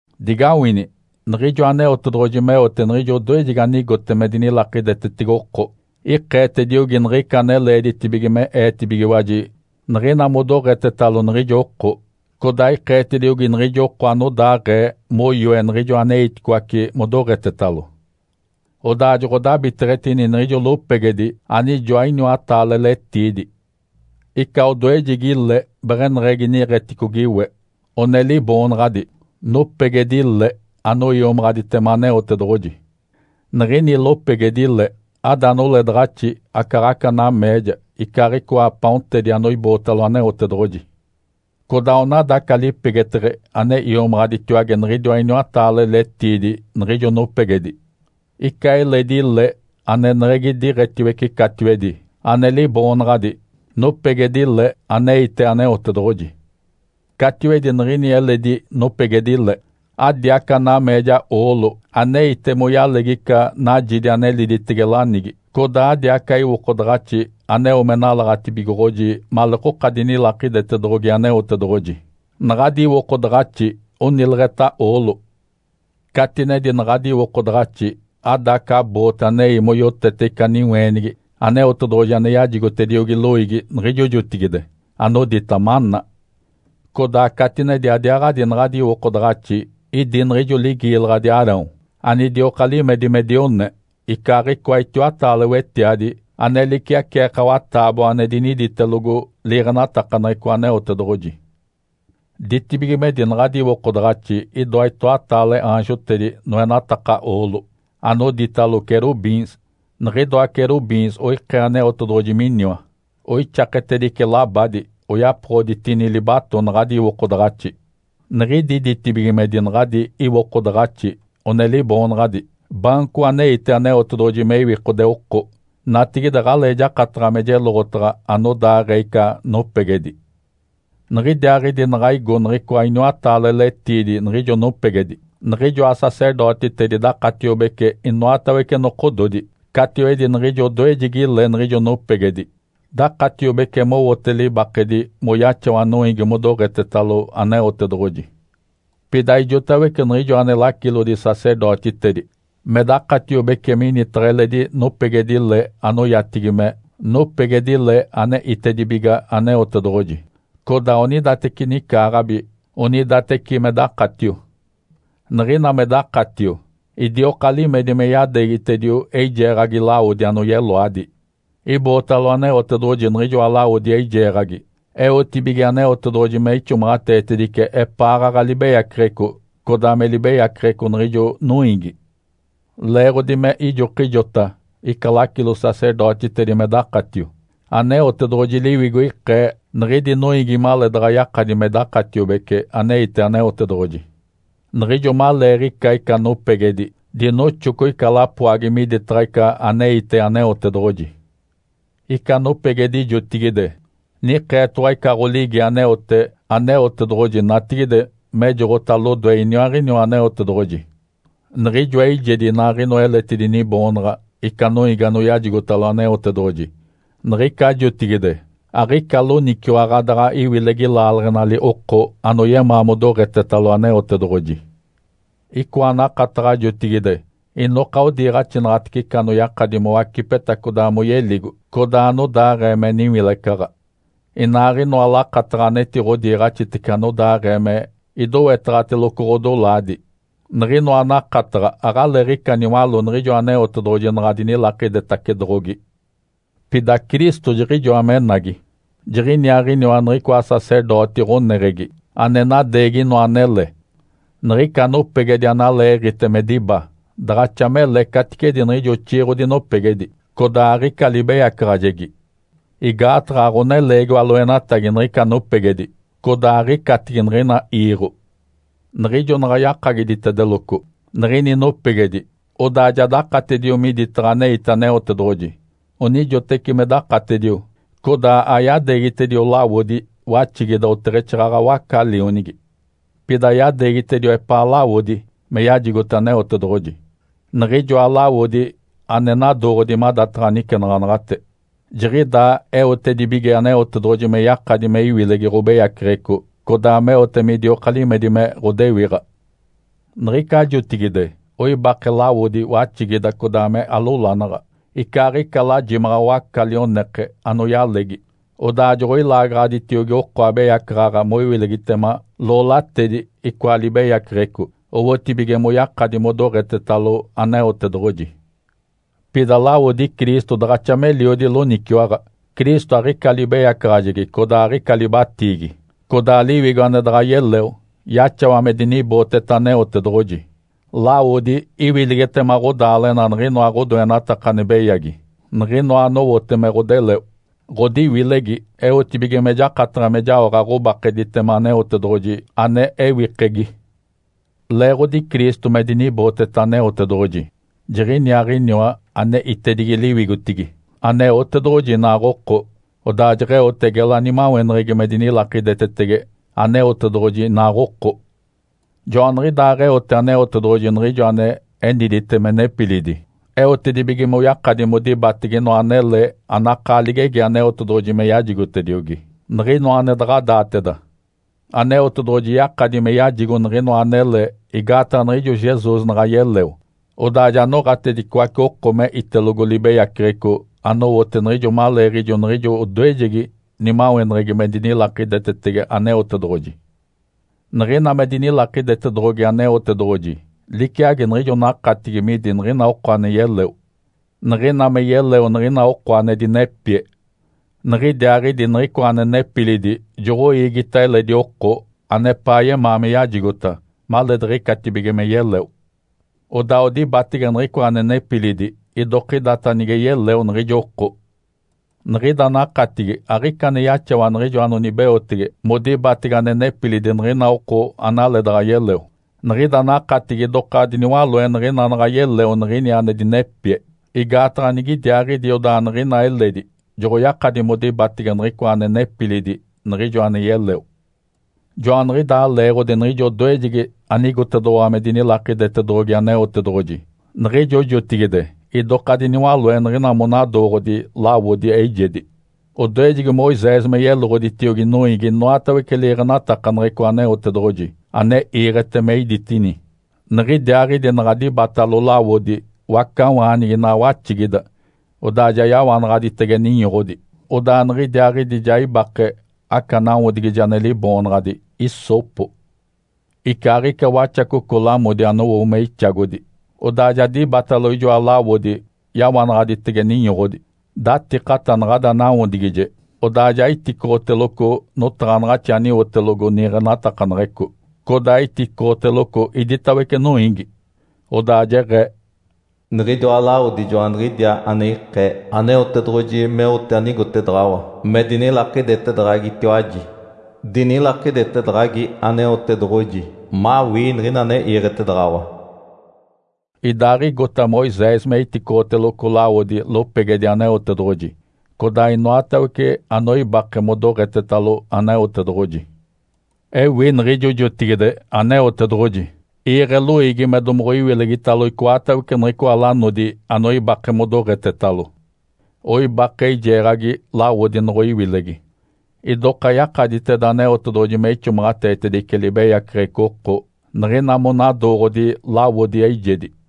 Digawini, niɡ̶ijo Aneotedoɡ̶oji meote niɡ̶ijo odoejegi anigote me dinilakidetetege oko, ikeetediogi niɡ̶ica ane leeditibige me eetibigiwaji niɡ̶ina modoɡ̶etetalo niɡ̶ijo oko, codaa ikeetediogi niɡ̶ijo oko anodaaɡ̶ee moyoe niɡ̶ijo aneiticoace modoɡ̶etetalo. Odaa joɡ̶odabiteɡ̶etini niɡ̶ijo lopegedi anijoa iniwataale letiidi. Ica odoejegi le beɡ̶eneɡ̶egi niiɡ̶eticogi we, one liboonaɡ̶adi, “Nopegedi-le anoiomaɡ̶aditema Aneotedoɡ̶oji”. Niɡ̶ini lopegedi-le ada noledaɡ̶axi, acaaɡ̶aca nameeja, icaaɡ̶icoa paontedi anoibootalo Aneotedoɡ̶oji. Codaa onada aca lipegeteɡ̶e ane iomaɡ̶aditiwage niɡ̶idiwa iniwataale letiidi niɡ̶ijo nopegedi. Ica eledi le aneneɡ̶egi diiɡ̶etiwece catiwedi ane liboonaɡ̶adi, “Nopegedi-le aneite Aneotedoɡ̶oji.” Catiwedi niɡ̶ini eledi nopegedi-le, adi aca nameeja oolo aneite moyalegi ica najidi ane liditege lanigi, codaa adi aca iwokodaɡ̶axi aneo me nalaɡ̶atibigoɡ̶oji maleekoka dinilakidetedoɡ̶ogi Aneotedoɡ̶oji. Naɡ̶adi iwokodaɡ̶axi onileɡ̶eta oolo. Catinedi naɡ̶adi iwokodaɡ̶axi ada aca boote anei moyotete ica niweenigi Aneotedoɡ̶oji ane yajigotediogi loiigi niɡ̶ijo jotigide, anodita “Maná”. Codaa catinedi adiaaɡ̶adi naɡ̶adi iwokodaɡ̶axi idi niɡ̶ijo ligiilaɡ̶adi Arão anidioka limedi me dione, icaaɡ̶icoa itiwataale wetiadi ane liciaceekawa taaboa ane diniditelogo liiɡ̶enatakaneɡ̶eco Aneotedoɡ̶oji. Ditibigimedi naɡ̶adi iwokodaɡ̶axi idoa itoataale aanjotedi noenataka oolo, anoditalo “Querubins”. Niɡ̶idoa querubins oikee Aneotedoɡ̶oji miniwa. Oixaketedice labadi oyapoɡ̶oditini libato naɡ̶adi iwokodaɡ̶axi. Niɡ̶idi ditibigimedi naɡ̶adi iwokodaɡ̶axi one liboonaɡ̶adi “Baanco aneite Aneotedoɡ̶oji me iwikode oko.” Natigide aɡ̶alee jakataɡ̶a me jeloɡ̶otaɡ̶a anodaaɡ̶ee ica nopegedi. Niɡ̶idiaaɡ̶idi naɡ̶a igo niɡ̶icoa iniwataale letiidi niɡ̶ijo nopegedi, niɡ̶ijoa sacerdotitedi dakatiobece inoatawece nokododi catiwedi niɡ̶ijo odoejegi le niɡ̶ijo nopegedi. Dakatiobece mowote libakedi moyaxawa noiigi modoɡ̶etetalo Aneotedoɡ̶oji. Pida ijotawece niɡ̶ijo ane lacilodi-sacerdotitedi me dakatiobece minitaɡ̶a eledi nopegedi-le anoyatigi me “Nopegedi-le ane itedibiga Aneotedoɡ̶oji”, codaa onidateci nicaaɡ̶abi onidateci me dakatio. Niɡ̶ina me dakatio, idioka limedi me yadeegitedio eijeeɡ̶agi lawodi anoyeloadi. Ibootalo Aneotedoɡ̶oji niɡ̶ijoa lawodi eijeeɡ̶agi eotibige Aneotedoɡ̶oji me ixomaɡ̶ateetedice epaaɡ̶aɡ̶a libeyaceɡ̶eco, codaa me libeyaceɡ̶eco niɡ̶ijo noiigi. Leeɡ̶odi me ijokijota ica lacilo-sacerdotitedi me dakatio, Aneotedoɡ̶oji Liwigo ikee niɡ̶idi noiigi maleedaɡ̶a yakadi me dakatiobece aneite Aneotedoɡ̶oji. Niɡ̶ijo maleeɡ̶ica ica nopegedi, dinoxoco ica lapoagi miditaɡ̶a ica aneite Aneotedoɡ̶oji. Ica nopegedi jotigide, nikeetoɡ̶owa ica ɡ̶oligi aneote Aneotedoɡ̶oji natigide mejoɡ̶ota lodoe iniaaɡ̶iniwa Aneotedoɡ̶oji. Niɡ̶ijoa eijedi inaaɡ̶inoa eletidi niboonaɡ̶a ica noiigi anoyajigotalo Aneotedoɡ̶oji niɡ̶ica jotigide aɡ̶ica loniciwaɡ̶a daɡ̶a iwilegi laaleɡ̶enali oko anoyemaa modoɡ̶etetalo Aneotedoɡ̶oji. Icoa nakataɡ̶a jotigide inoka odiiɡ̶axinaɡ̶atece ica anoyakadi mowacipeta codaa moyeligo, codaa anodaaɡ̶ee me niwilecaɡ̶a. Inaaɡ̶inoa lakataɡ̶a anetiɡ̶odiiɡ̶axitece anodaaɡ̶ee me idowetaɡ̶ateloco ɡ̶odolaadi. Niɡ̶inoa nakataɡ̶a aɡ̶aleeɡ̶ica niwaló niɡ̶ijo Aneotedoɡ̶oji naɡ̶a dinilakidetacedoɡ̶ogi. Pida Cristo jiɡ̶ijoa menagi. Jiɡ̶iniaaɡ̶iniwa niɡ̶icoa sacerdoti ɡ̶oneɡ̶egi ane nadeegi inoa anele. Niɡ̶ica nopegedi analeeɡ̶ite me diba daɡ̶axa mele caticedi niɡ̶ijo oxiiɡ̶odi nopegedi, codaa aɡ̶ica libeyacaɡ̶ajegi. Igaataɡ̶a aɡ̶oneleegiwa loenatagi niɡ̶ica nopegedi, codaa aɡ̶icatigi niɡ̶ina iiɡ̶o. Niɡ̶ijo naɡ̶a yakagiditedeloco niɡ̶ini nopegedi, odaa ja dakatedio miditaɡ̶a aneite Aneotedoɡ̶oji. Onijoteci me dakatedio, codaa ayadeegitedio lawodi waxigida oteɡ̶exaaɡ̶aɡ̶a waca-lionigi. Pida yadeegitedio epaa lawodi me yajigote Aneotedoɡ̶oji, niɡ̶ijoa lawodi ane nadooɡ̶odi madataɡ̶a nicenaɡ̶anaɡ̶ate. Jiɡ̶idaa eotedibige Aneotedoɡ̶oji me yakadi me iwilegi ɡ̶obeyaceɡ̶eco codaa meote midioka limedi me ɡ̶odewiɡ̶a. Niɡ̶ica jotigide oibake lawodi waxigida codaa me alolanaɡ̶a, icaaɡ̶ica lajimaɡ̶a waaca lioneke anoyalegi, odaa joɡ̶oilaagaɡ̶aditiogi oko abeyacaɡ̶aɡ̶a moiwilegitema loolatedi icoa libeyaceɡ̶eco, owotibige moyakadi modoɡ̶etetalo Aneotedoɡ̶oji. Pida lawodi Cristo daɡ̶axa meliodi loniciwaɡ̶a. Cristo aɡ̶ica libeyacaɡ̶ajegi codaa aɡ̶ica libatiigi. Codaa Liwigo, ane daɡ̶a yeleo, yaxawa me dinibooteta Aneotedoɡ̶oji. Lawodi iwilegitema ɡ̶odaaleɡ̶ena niɡ̶inoa ɡ̶odoenataka ane beyagi, niɡ̶inoa anowote me ɡ̶odeleo. Ǥodiwilegi eotedibige me jakataɡ̶a me jaoɡ̶a ɡ̶obakeditema Aneotedoɡ̶oji, ane ewikegi. Leeɡ̶odi Cristo me dinibooteta Aneotedoɡ̶oji, jiɡ̶iniaaɡ̶iniwa ane itedigi liwigotigi, Aneotedoɡ̶oji inaaɡ̶oko, odaa jeɡ̶eote gela nimaweneɡ̶egi me dinilakidetetege Aneotedoɡ̶oji inaaɡ̶oko. Joaniɡ̶idaaɡ̶eote Aneotedoɡ̶oji niɡ̶ijo ane enidite me nepilidi, eotedibige moyakadi modibatege inoa anele anakaa ligegi Aneotedoɡ̶oji me yajigotediogi, niɡ̶inoa ane daɡ̶a daateda. Aneotedoɡ̶oji yakadi me yajigo niɡ̶inoa anele igaataɡ̶a niɡ̶ijo Jesus naɡ̶a yeleo, odaa ja noɡ̶atedicoace oko me itelogo libeyaceɡ̶eco anowote niɡ̶ijo maleeɡ̶ijo niɡ̶ijo odoejegi nimaweneɡ̶egi me dinilakidetetege Aneotedoɡ̶oji. Niɡ̶ina me dinilakidetedoɡ̶ogi Aneotedoɡ̶oji liciagi niɡ̶ijo nakatigi midi niɡ̶ina oko ane yeleo. Niɡ̶ina me yeleo niɡ̶ina oko ane dinepie. Nigidiaaɡ̶idi niɡ̶icoa ane nepilidi joɡ̶oiigita eledi oko anepaa yemaa me yajigota maleediɡ̶icatibige me yeleo. Odaa odibatege niɡ̶icoa ane nepilidi idokidata nige yeleo niɡ̶ijo oko. Niɡ̶ida nakatigi aɡ̶ica ane yaxawa niɡ̶ijo anonibeotege modibatege ane nepilidi niɡ̶ina oko analeedaɡ̶a yeleo. Niɡ̶ida nakatigi idoka diniwaloe niɡ̶ina naɡ̶a yeleo niɡ̶ini ane dinepie, igaataɡ̶a nigidiaaɡ̶idi odaa niɡ̶ina eledi joɡ̶oyakadi modibatege niɡ̶icoa ane nepilidi niɡ̶ijo ane yeleo. Joaniɡ̶idaa leeɡ̶odi niɡ̶ijo odoejegi anigotedoɡ̶owa me dinilakidetedoɡ̶ogi Aneotedoɡ̶oji, niɡ̶ijo jotigide idoka diniwaloe niɡ̶ina monadooɡ̶odi lawodi eijedi. Odoejegi Moisés me yeloɡ̶oditiogi noiigi inoatawece liiɡ̶enatakaneɡ̶eco Aneotedoɡ̶oji ane iiɡ̶ete me iditedini. Niɡ̶idiaaɡ̶idi naɡ̶a dibatalo lawodi wacawaanigi inaa waxigida, odaa ja yawanaɡ̶aditege ninyoɡ̶odi, odaa niɡ̶idiaaɡ̶idi ja ibake aca nawodigije ane liboonaɡ̶adi “hissopo” icaaɡ̶ica waxacoco lamodi anowo me ixagodi. Odaa ja dibatalo ijoa lawodi yawanaɡ̶aditege ninyoɡ̶odi, datikata naɡ̶ada nawodigije, odaa ja iticoɡ̶oteloco notaɡ̶anaɡ̶axi aniwotelogo niiɡ̶enatakaneɡ̶eco, codaa iticoɡ̶oteloco iditawece noiigi. Odaa jeɡ̶ee, “Niɡ̶idiwa lawodi joaniɡ̶idiaa ane ikee Aneotedoɡ̶oji meote anigotedaɡ̶awa me dinilakidetedaɡ̶agitiwaji. Dinilakidetedaɡ̶agi Aneotedoɡ̶oji mawii niɡ̶ina ane iiɡ̶etedaɡ̶awa.” Idaaɡ̶aɡ̶igota Moisés me iticoɡ̶oteloco lawodi lopegedi Aneotedoɡ̶oji codaa inoatawece anoibake modoɡ̶etetalo Aneotedoɡ̶oji. Ewi niɡ̶ijo jotigide Aneotedoɡ̶oji iiɡ̶e loiigi me domoɡ̶oiwilegitalo icoatawece niɡ̶icoa lanodi anoibake modoɡ̶etetalo. Oibake eijeeɡ̶agi lawodi noɡ̶oiwilegi. Idoka yakaditeda Aneotedoɡ̶oji me ixomaɡ̶ateetedice libeyaceɡ̶eco oko niɡ̶ina monadooɡ̶odi lawodi eijedi.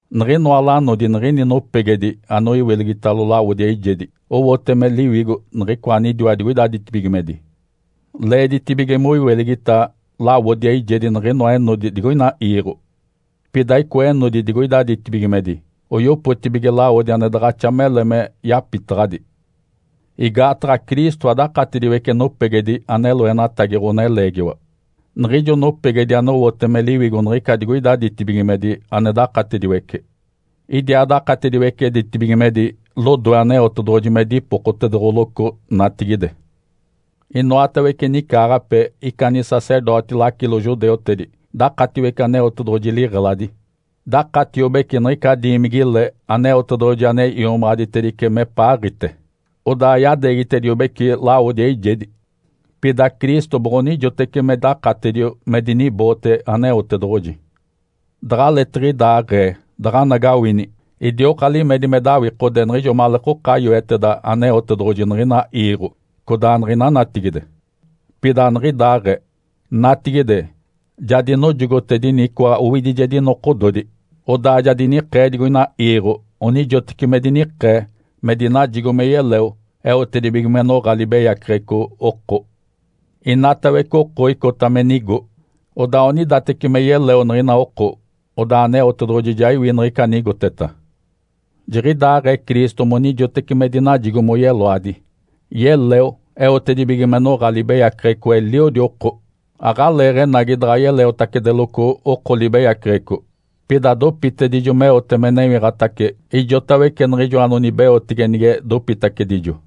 Niɡ̶inoa lanodi niɡ̶ini nopegedi anoiwilegitalo lawodi eijedi owote me liwigo niɡ̶icoa anidiwa digoida ditibigimedi. Leeditibige moiwilegita lawodi eijedi niɡ̶inoa enodi digoina iiɡ̶o. Pida icoa enodi digoida ditibigimedi oyopotibige lawodi ane daɡ̶axa mele me yapitaɡ̶adi. Igaataɡ̶a Cristo adakatediwece nopegedi ane loenatagi ɡ̶oneleegiwa. Niɡ̶ijo nopegedi onowote me liwigo niɡ̶ica digoida ditibigimedi ane dakatediwece. Idiaa dakatediwece ditibigimedi lodoe Aneotedoɡ̶oji me dipokotedoɡ̶oloco natigide. Inoatawece nicaaɡ̶ape ica nisacerdoti-lacilo judeutedi dakatiwece Aneotedoɡ̶oji liɡ̶eladi. Dakatiobece niɡ̶ica diimigi-le Aneotedoɡ̶oji ane iomaɡ̶aditedice mepaaɡ̶ite, odaa yadeegitediobeci lawodi eijedi. Pida Cristo boɡ̶onijotece me dakatedio me diniboote Aneotedoɡ̶oji. Daɡ̶aleetiɡ̶idaaɡ̶ee daɡ̶anagawini, idioka limedi me dawikode niɡ̶ijo maleekoka yoeteda Aneotedoɡ̶oji niɡ̶ina iiɡ̶o codaa niɡ̶ina natigide. Pida aniɡ̶idaaɡ̶ee. Natigide, ja dinojogotedini icoa owidijedi nokododi, odaa ja dinikee digoina iiɡ̶o onijoteci me dinikee me dinajigo me yeleo eotedibige me noɡ̶a libeyaceɡ̶eco oko. Inatawece oko icota me nigo, odaa onidateci me yeleo niɡ̶ina oko. Odaa Aneotedoɡ̶oji ja iwi niɡ̶ica anigoteta. Jiɡ̶idaaɡ̶ee Cristo monijoteci me dinajigo moyeloadi. Yeleo eotedibige me noɡ̶a libeyaceɡ̶eco eliodi oko. Aɡ̶aleeɡ̶enagi daɡ̶a yeleotacedeloco oko libeyaceɡ̶eco. Pida dopitedijo meote me newiɡ̶atace ijotawece niɡ̶ijo anonibeotege nige dopitacedijo.